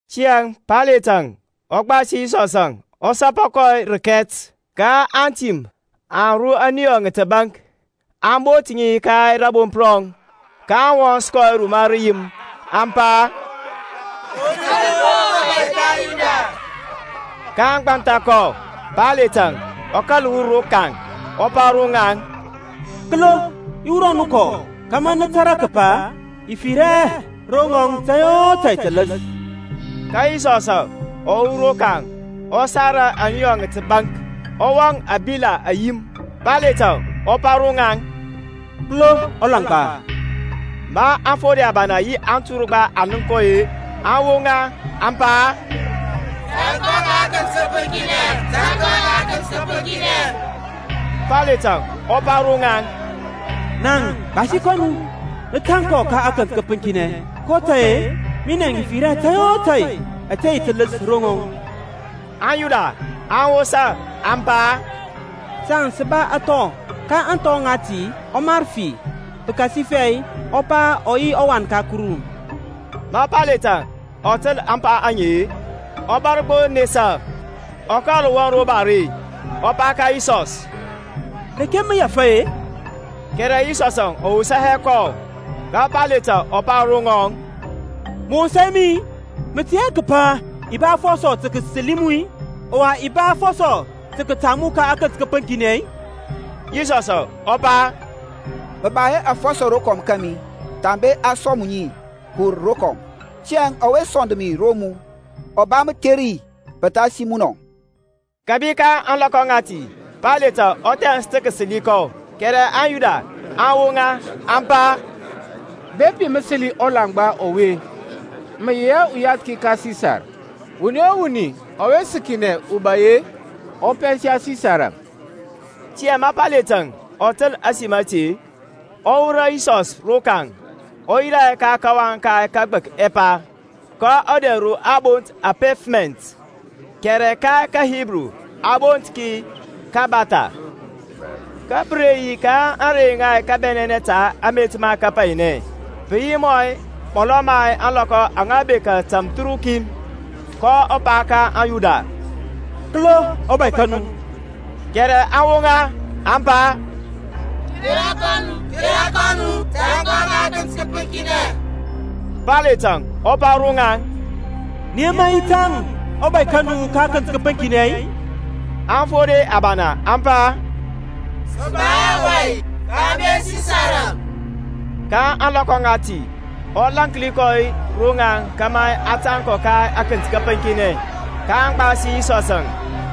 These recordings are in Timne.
Tiyȧŋ Payletȧŋ ɔ gbasi Yisɔsȧŋ ɔ sapa kɔ rəkɛt. Ka antim aŋ ru ȧniyɔ ŋa təbaŋk, aŋ bot ŋi ka rȧbomp rɔŋ, kaŋ wɔns kɔ ruma rəyim. Aŋ pa, Kori mu-o ɔBȧy ka aŋYuda! kaŋ gbantha kɔ. Payletȧŋ ɔ kȧl wur rokaŋ, ɔ pa ro ŋaŋ, Kəlo i wurɔ nu kɔ, kȧmȧ nə tȧrȧ kəpa i fir hɛ ro ŋɔŋ tȧy o tȧy tələs. Ka Yisɔsȧŋ ɔ wur rokaŋ, ɔ sara ȧŋniyɔ ŋa təbaŋk, ɔ wɔŋ ȧŋbila ayim. Payletȧŋ ɔ pa ro ŋaŋ, Kəlo ɔlaŋgba! Ma aŋfode abana yi anturgba aŋ nənk kɔ-e, aŋ woŋa, aŋ pa, Tȧŋ kɔ ka akənt kəpəŋkinɛ, tȧŋ kɔ ka akənt kəpəŋkinɛ! Payletȧŋ ɔ pa ro ŋaŋ, Naŋ gbasi kɔ nu, nə tȧŋ kɔ ka akənt kəpəŋkinɛ, kotȧy-e minɛ i fir hɛ tȧy o tȧy ȧte yi tələs ro ŋɔŋ. AŋYuda aŋ wosa, aŋ pa, Saŋ sə ba athɔ, ka ȧŋthɔ ŋati ɔ mar fi, pəkasifɛ ɔ pa ɔ yi ɔWan ka Kuru. Ma Payletȧŋ ɔ təl ȧŋpa aŋe-e, ɔ bȧr gbo nesa. Ɔ kȧl wɔŋ ro bare, ɔ pa ka Yisɔs, Reke mə wur-e? Kɛrɛ Yisɔsȧŋ ɔ wosa hɛ kɔ. Ka Payletȧŋ ɔ pa ro ŋɔŋ, Mə wosa hɛ mi-i? Mə tɛ hɛ kəpa i ba afɔsɔ tə kəsəli mu, ɔwa i ba afɔsɔ tə kətaŋ mu ka akənt kəpəŋkinɛ-i? Yisɔsȧŋ ɔ pa, Mə ba hɛ afɔsɔ rokɔm kȧmi thambe a sɔŋ mu ŋi kəwur rokɔm: tiyȧŋ ɔwe sɔnd mi ro mu, ɔ ba mətheri pəthasi munɔ. Kəbi ka ȧŋlɔkɔ ŋati Payletȧŋ ɔ thɛns tə kəsəli kɔ; kɛrɛ aŋYuda aŋ woŋa, aŋ pa, Bepi mə səli ɔlaŋgba ɔwe-e, mə yi hɛ uyathki ka Sisar: wuni o wuni ɔwe səkinɛ ubai-e, ɔ pɛnsa Sisarȧŋ. Tiyȧŋ ma Payletȧŋ ɔ təl ȧsim ȧte-e, ɔ wurɔ Yisɔs rokaŋ, ɔ yirȧ ka kawaŋ ka kəgbək ɛpa, ka ɔdɛr ro a bont ȧŋPefmɛnt, kɛrɛ ka kaHibru a bont Kabatha. Kə pə re yi ȧŋrey ŋa kabɛnɛnɛ ta amet ma kapainɛ; pə yi mɔlɔ ma ȧŋlɔkɔ aŋa bekȧ tamthərukin: kɔ pa ka aŋYuda, Kəlo ɔBȧy ka nu! Kɛrɛ aŋ woŋa, aŋ pa, Kera kɔ nu, kera kɔ nu, tȧŋ kɔ ka akənt kəpəŋkinɛ. Payletȧŋ ɔ pa ro ŋaŋ, Nə yema i tȧŋ ɔBȧy ka nu ka akənt kəpəŋkinɛ-i? Aŋfode abana aŋ pa, Sə ba hɛ ubȧy thambe Sisarȧŋ. Ka ȧŋlɔkɔ ŋati ɔ lȧnki kɔ ro ŋaŋ kȧmȧ a tȧŋ kɔ ka akənt kəpəŋkinɛ. kaŋ gbasi Yisɔsȧŋ.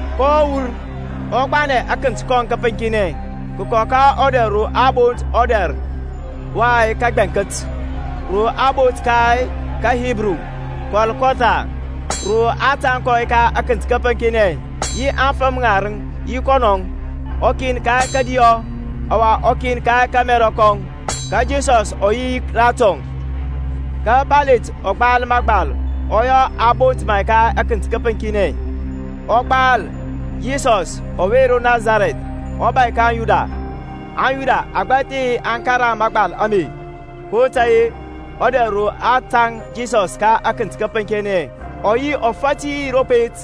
kɔ wur, ɔ gbanɛ akənt kɔŋ kəpəŋkinɛ kəkɔ ka ɔdɛr ro a bont, Ɔdɛr wa Kəgbɛŋkət, ro a bont ka kaHibru, Kɔlkɔtha: ro aŋ tȧŋ kɔ ka akənt kəpəŋkinɛ, yi afəm ŋarəŋ yi kɔnɔŋ, ukin ka kȧdiyɔ, ɔwa ukin ka kȧmɛrɔ kɔŋ, ka Yisɔsȧŋ ɔ yi ratɔŋ. Ka Payletȧŋ ɔ gbal məgbal, ɔ yɔ aŋ bot ma ka akənt kəpəŋkinɛ. Ɔ gbal, YISƆSȦŊ ƆWE RO NASARƐTH, ƆBȦY KA AŊYUDA. AŋYuda agbȧthi aŋ karaŋ mȧgbal ame: kotȧy-e, ɔdɛr ro a tȧŋ Yisɔs ka akənt kəpəŋkinɛ ɔ yi ɔfati ro pet: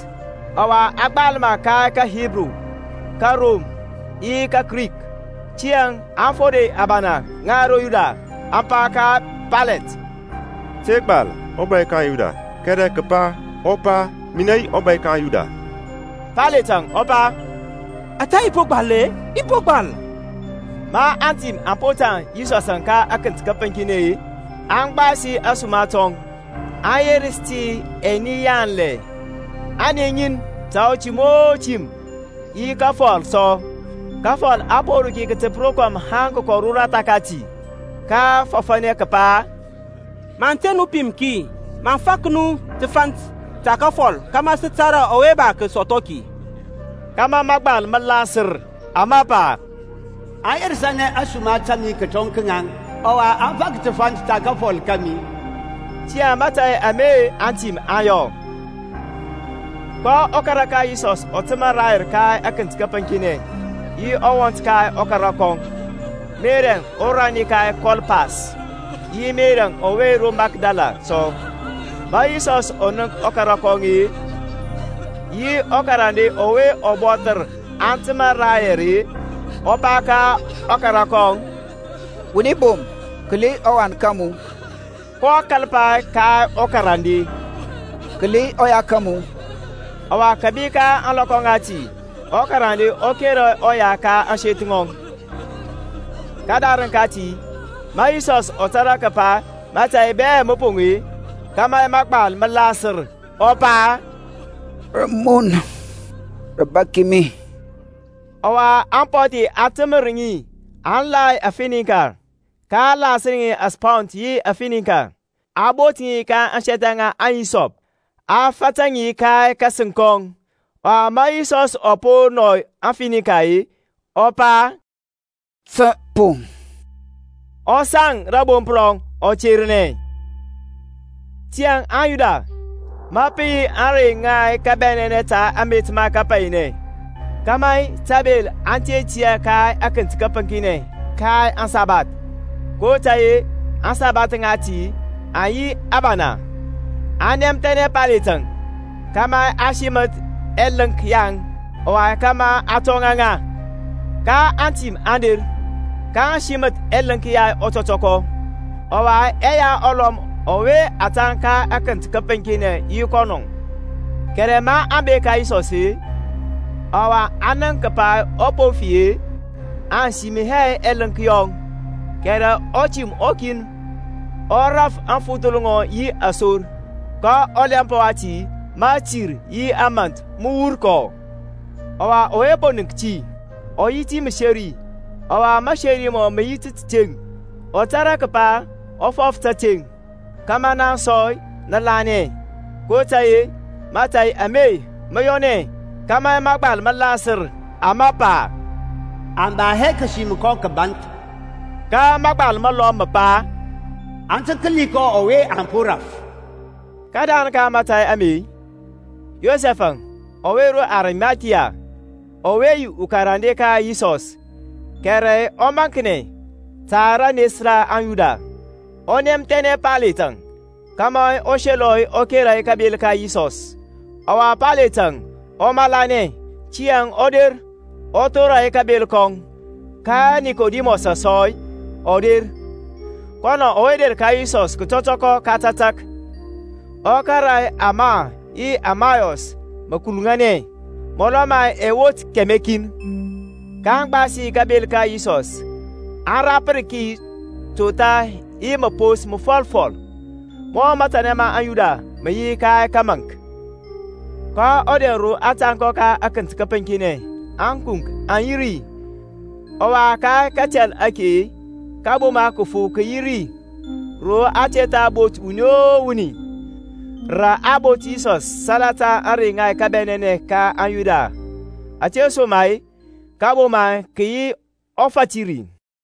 ɔwa a gbal ma ka kaHibru, kaRom, yi kaKrik. Tiyȧŋ aŋfode abana ŋa aŋYuda aŋ pa ka Paylet, Te gbal, ɔBay ka aŋYuda; kɛrɛ kəpa, Ɔ pa, Minɛ yi ɔBȧy ka aŋYuda. Payletȧŋ ɔ pa, Ȧtȧ i po gbal-e, i po gbal. Ma antim aŋ po tȧŋ Yisɔsȧŋ ka akənt kəpəŋkinɛ-e aŋ gbasi ȧsuma tɔŋ, aŋ yerəs ti ɛni yanlɛ, ani ŋin ta utim o tim; yi kafɔl sɔ; kafɔl a po ru ki kətəp rokɔm haŋ kəkɔ roratha kati. kaŋ fɔfȧnɛ kəpa, Maŋ te nu pim ki, maŋ fak nu təfant ta kafɔl kȧmȧ sə tȧrȧ ɔwe ba kəsɔthɔ ki; kȧmȧ mȧgbal mə lasər, ama pa, Aŋ yerəs ȧsuma ta mi kətɔŋ ka ŋaŋ, Ɔwa aŋ fak təfant ta kafɔl kȧmi. Tiyȧŋ mȧtȧy ame antim aŋ yɔ. Ka ɔkara ka Yisɔs ɔ təmȧ rayɛr ka akənt kəpəŋkinɛ, yi ɔwɔnt ka ɔkara kɔŋ, Merɛŋ ɔrani ka Klopas, yi Meri ɔwe ro Makdala sɔ. Ma Yisɔsȧŋ ɔ nənk ɔkara kɔŋ-e, yi ɔkarande ɔwe ɔ bɔthər aŋ təmȧ rayɛr-e, ɔ pa ka ɔkara kɔŋ, Wuni bom, kəli ɔwan ka mu! kɔ kȧl pa ka ɔkarande, Kəli ɔya ka mu! Ɔwa kȧbi ka ȧŋlɔkɔ ŋati ɔkarande ɔ kera ɔya ka ȧŋseth ŋɔŋ. Kədarəŋ kati, ma Yisɔsȧŋ ɔ tȧrȧ kəpa mȧtȧy bɛ mə poŋ-e, kȧmȧ mȧgbal mə lasər, ɔ pa, Rəmun rə bȧk mi. Ɔwa apɔthi aŋ təmȧ ri aŋ la afinika; kaŋ lasər asponge yi afinika, aŋ bot ŋi ka ȧŋsɛthɛ ŋa ahisɔp, a fata ŋi ka kȧsəŋ kɔŋ. Ɔwa ma Yisɔsȧŋ ɔ po nɔy aŋfinikar, ɔ pa, Tə poŋ: ɔ saŋ rȧbomp rɔŋ ɔ ternɛ. Tiyȧŋ aŋYuda, ma pə yi ȧŋrey ŋa kabɛnɛnɛ ta amet ma kapainɛ, kȧmȧ tabel aŋ te tiyȧ ka atənt təpəŋkinɛ ka aŋsabath (kotȧy-e aŋsabath ŋati aŋ yi abana), aŋ nɛmthɛnɛ Payletȧŋ kȧmȧ a siməth ɛlənk yaŋ, ɔwa kȧmȧ a tɔŋa ŋa. Ka antim aŋ der, kaŋ siməth ɛlənk ya ɔtɔtɔkɔ, ɔwa ɛya ɔlɔm ɔwe a tȧŋ ka akənt kəpəŋkinɛ yi kɔnɔ. Kɛrɛ maŋ bek ka Yisɔs-e, ɔwa aŋ nənk kəpa ɔ po fi-e, aŋ sim hɛ ɛlənk yɔŋ: kɛrɛ utim ukin ɔ raf aŋfuthəl ŋɔŋ yi asor, ka ɔlɛmp wati mȧtir yi mȧnt mə wur kɔ. Ɔwa ɔwe po nənk ti ɔ yi ti məseri, ɔwa maseri mɔŋ mə yi tȧteŋ: ɔ tȧrȧ kəpa ɔ fɔf tȧteŋ, kȧmȧ naŋ sɔ nə lanɛ. kotȧy-e mȧtȧy ame mə yɔnɛ, kȧmȧ mȧgbal mə lasər, ama pa, A ba hɛ kəsim kɔ kəbȧnth. Ka məgbal məlɔm mə pa, Aŋ tə kəli kɔ ɔwe aŋ po raf. Kədarəŋ ka mȧtȧy ame, Yosɛf-əŋ ɔwe ro Arimathia, ɔwe yi ukarande ka Yisɔs, kɛrɛ rə ɔmaŋknɛ, ta rənes ra aŋYuda, ɔ nɛmthɛnɛ Payletȧŋ kȧmȧ ɔ selɔ ɔ kera kabel ka Yisɔs; ɔwa Payletȧŋ ɔ malanɛ. Tiyȧŋ ɔ der, ɔ thora kabel kɔŋ. Ka Nikodimɔs sɔ ɔ der, kɔnɔ ɔwe der ka Yisɔs kətɔtɔkɔ ka tȧtȧk, ɔ kȧrȧ ama yi məalos mə kuluŋanɛ, mɔlɔ ma ɛwet kɛmɛ kin. kaŋ gbasi kabel ka Yisɔs, aŋ rapər ki totha yi məpos məfɔlfɔl, mɔ matanɛ ma aŋYuda mə yi ka kəmȧnk. Ka ɔdɛr ro a tȧŋ kɔ ka akənt kəpəŋkinɛ ȧkunk aŋ yi ri; ɔwa ka katɛl ake kȧboma kəfu kə yi ri, ro a te tha bot wuni o wuni. Rə aŋ bot Yisɔsȧŋ salata ȧŋrey ŋa kabɛnɛnɛ ka aŋYuda: ȧtesoma-e kȧboma kə yi ɔfati ri.